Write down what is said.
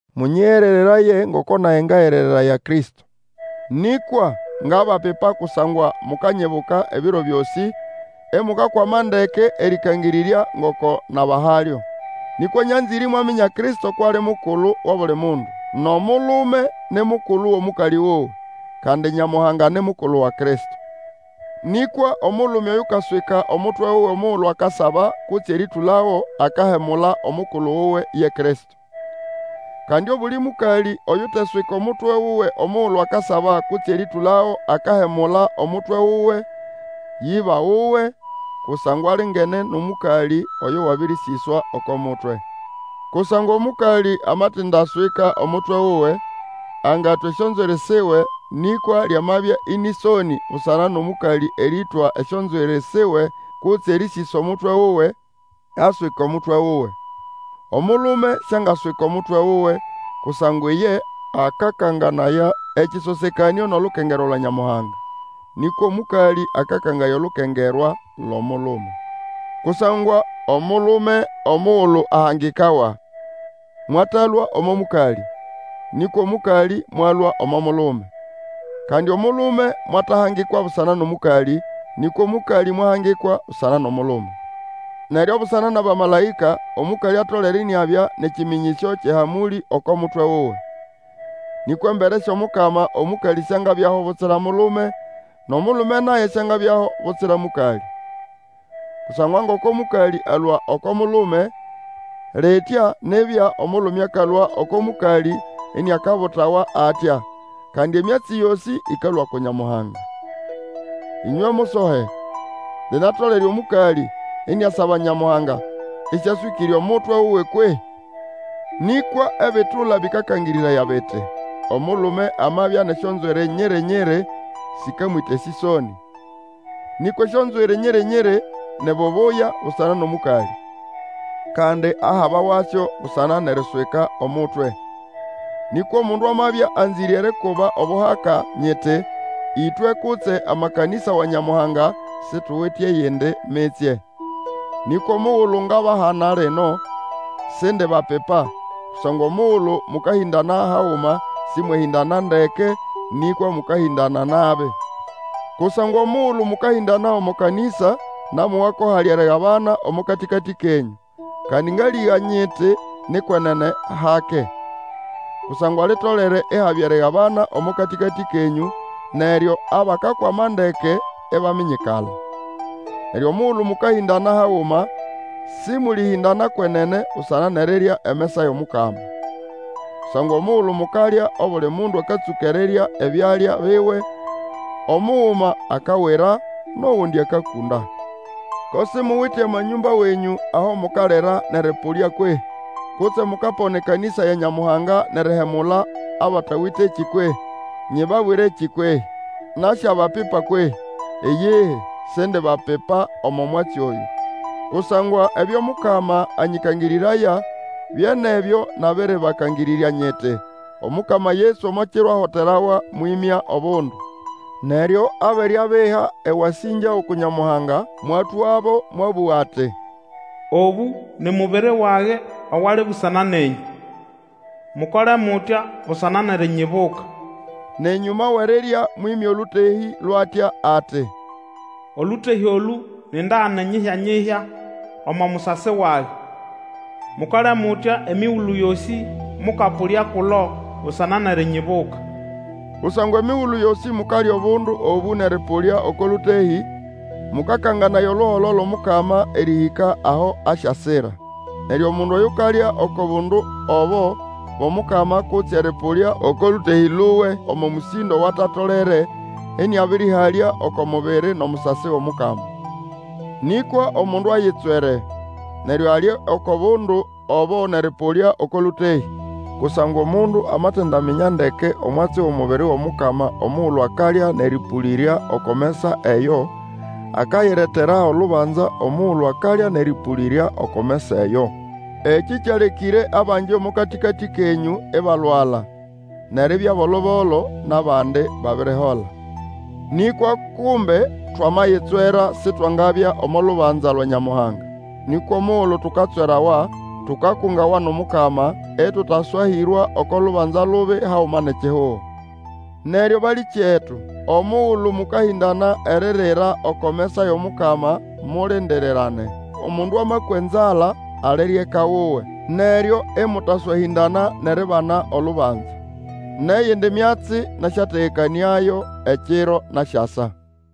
Mũnyĩgerereraye ngoko nage ngagerereraya Kristo. Nĩkwa ngabapipa kusangwa mukanyibuka ebiro byosĩ, imukakwama ndeke erĩkangĩrĩrya, ngoko nabahalyo. Nĩkwa nyanzĩre imwaminya Kristo kwʼali mukulu wʼobuli mundu, nʼomulume ni mukulu wʼomũkalĩ wuwe, kandi Nyamuhanga ni mukulu wa Kristo. Nĩkwa omulume oyukaswika omutwe wuwe omugulu akasaba kutse erĩtũlago, akahemula omukulu wuwe, ye Kristo. Kandi obuli mũkalĩ oyuteswika omutwe wuwe omugulu akasaba kutse erĩtũlago, akahemula omutwe wuwe, yʼĩba wuwe; kusangwa alingene nʼomũkalĩ oyo wabĩrĩsĩswa oko mutwe. Kusangwa omũkalĩ amatindaswika omutwe wuwe, angatwa esyonzwiri siwe, nĩkwa lyamabya ĩnĩ ĩsonĩ busana nʼomũkalĩ erĩtwa esyonzwiri siwe kutse erĩsĩsa omutwe wuwe, aswike omutwe wuwe. Omulume siangaswika omutwe wuwe, kusangwa iye akakanganaya ekĩsosekanĩo nʼolukengerwa bya Nyamuhanga. Nĩkwa omũkalĩ akakanganaya olukengerwa lwʼomulume. Kusangwa omulume omugulu ahangikawa, mwatalũa omo mũkalĩ, nĩkwa omũkalĩ mwalũa omo mulume. Kandi omulume mwatahangikwa busana nʼomũkalĩ, nĩkwa omũkalĩ mwahangikwa busana nʼomulume. Neryo busana nʼabamalaĩka, omũkalĩ atolere iniabya nʼekĩmĩnyĩsyo kyʼehamũlĩ oko mutwe wuwe. Nĩkwa embere syʼOmukama, omũkalĩ siangabyaho butsira mulume, nʼomulume naye siangabyaho butsira mũkalĩ. Kusangwa ngoko mũkalĩ alũa oko mulume, litya nibya omulume akalũa oko mũkalĩ iniakabulawa atya; kandi emyatsi yosĩ ĩkalũa uku Nyamuhanga. Ĩnywe musohe, linatolere omũkalĩ iniasaba Nyamuhanga ĩsĩaswĩkĩre omutwe wuwe kwehĩ? Nĩkwa ebitula bĩkabakangĩrĩraya biti, omulume amabya nʼesyonzwiri nyiri-nyiri, sĩkamwĩta esĩsonĩ, nĩkwa esyonzwiri nyiri-nyiri ni bubuya busana nʼomũkalĩ. Kandi ahabawasyo busana nʼeriswika omutwe. Nĩkwa omundu amabya anzĩre erikuba obuhaka nyiti, ĩtwe kutse amakanĩsa wa Nyamuhanga, situwite eyindi mitsye. Nĩkwa omugulu ngabahana lino, sindibapipa, kusangwa omugulu mũkahĩndana haguma sĩmwehĩndana ndeke, nĩkwa mũkahĩndana nabi. Kusangwa omugulu mũkahĩndana omo kanĩsa, namowa ko hali erigabana omo katĩkatĩ kenyũ; kandi ngalĩga nyiti ni kwenene hake. Kusangwa litolere ihabya erigabana omo katĩkatĩ kenyũ, neryo abakakwama ndeke ibaminyikala. Neryo omugulu mũkahĩndana haguma, sĩmũlĩhĩndana kwenene busana nʼerirya emesa yʼomukama. Kusangwa omugulu mukalya, obuli mundu akatsũka erirya ebyalya biwe; omuguma akawira, nʼogundi akakunda. Ko simuwite amanyũmba wenyũ aho mukalira nʼerĩpũlya kwehĩ? Kutse mukapona ekanĩsa ya Nyamuhanga, nʼerihemula abatawitekĩ kwehĩ? Nyibabwirekĩ kwehĩ? Nasyabapipa kwehĩ? Iyihi, sindibapipa omo mwatsi oyũ. Kusangwa ebyo Mukama anyĩkangĩrĩraya bye nʼebyo nabĩrĩbakangĩrĩrya nyiti, Omukama Yesu omo kiro ahoterawa mwĩmya obundu; neryo abere abiha ewasĩngya uku Nyamuhanga, mwatwabo, mwabũga ati, Obũ ni mubiri wage owali busana nenyũ. Mukole mutya busana nʼerinyibuka. Nʼenyũma wʼerirya mwĩmya olũtehĩ lwʼatya, ati, Olũtehĩ olũ ni ndagane nyihya-nyihya omo musasi wage; mukole mutya emigulu yosĩ mũkapũlaya kulo busana nʼerinyibuka. Kusangwa emigulu yosĩ mukalya obundu obũ nʼerĩpũlya oko lũtehĩ, mũkakanganaya oluholo lwʼOmukama, erĩhĩka aho asyasira. Neryo omundu oyukalya oko bundu obo bwʼomukama kutse erĩpũlya oko lũtehĩ luwe omo mũsĩndo owatatolere, ĩnĩabĩrĩhalya oko mubiri nʼomusasi wʼOmukama. Nĩkwa omundu ayitswere, neryo alye oko bundu obo nʼerĩpũlya oko lũtehĩ. Kusangwa omundu amatindaminya ndeke omwatsi wʼomubiri wʼOmukama omugulu akalya nʼerĩpũlĩrya oko mesa eyo, akayiretera olubanza omugulu akalya nʼerĩpũlĩrya oko mesa eyo. Ekĩ kyalekĩre abangi omo katĩkatĩ kenyũ ibalwala nʼeribya bolo-bolo, nʼabandi babirihola. Nĩkwa kumbe twamayitswera sitwangabya omo lubanza lwa Nyamuhanga. Nĩkwa omugulu tukatswerawa, tukakungawa nʼomukama, ĩtũtaswahĩrwa oko lubanza lubi haguma nʼekihugo. Neryo balĩkyetu, omugulu mũkahĩndana eririra oko mesa yʼomukama, mulindirirane. Omundu amakwa enzala, alire eka wuwe, neryo ĩmũtaswahĩndana nʼeribana olubanza. Nʼeyindi myatsi nasyategekanĩayo ekiro nasyasa.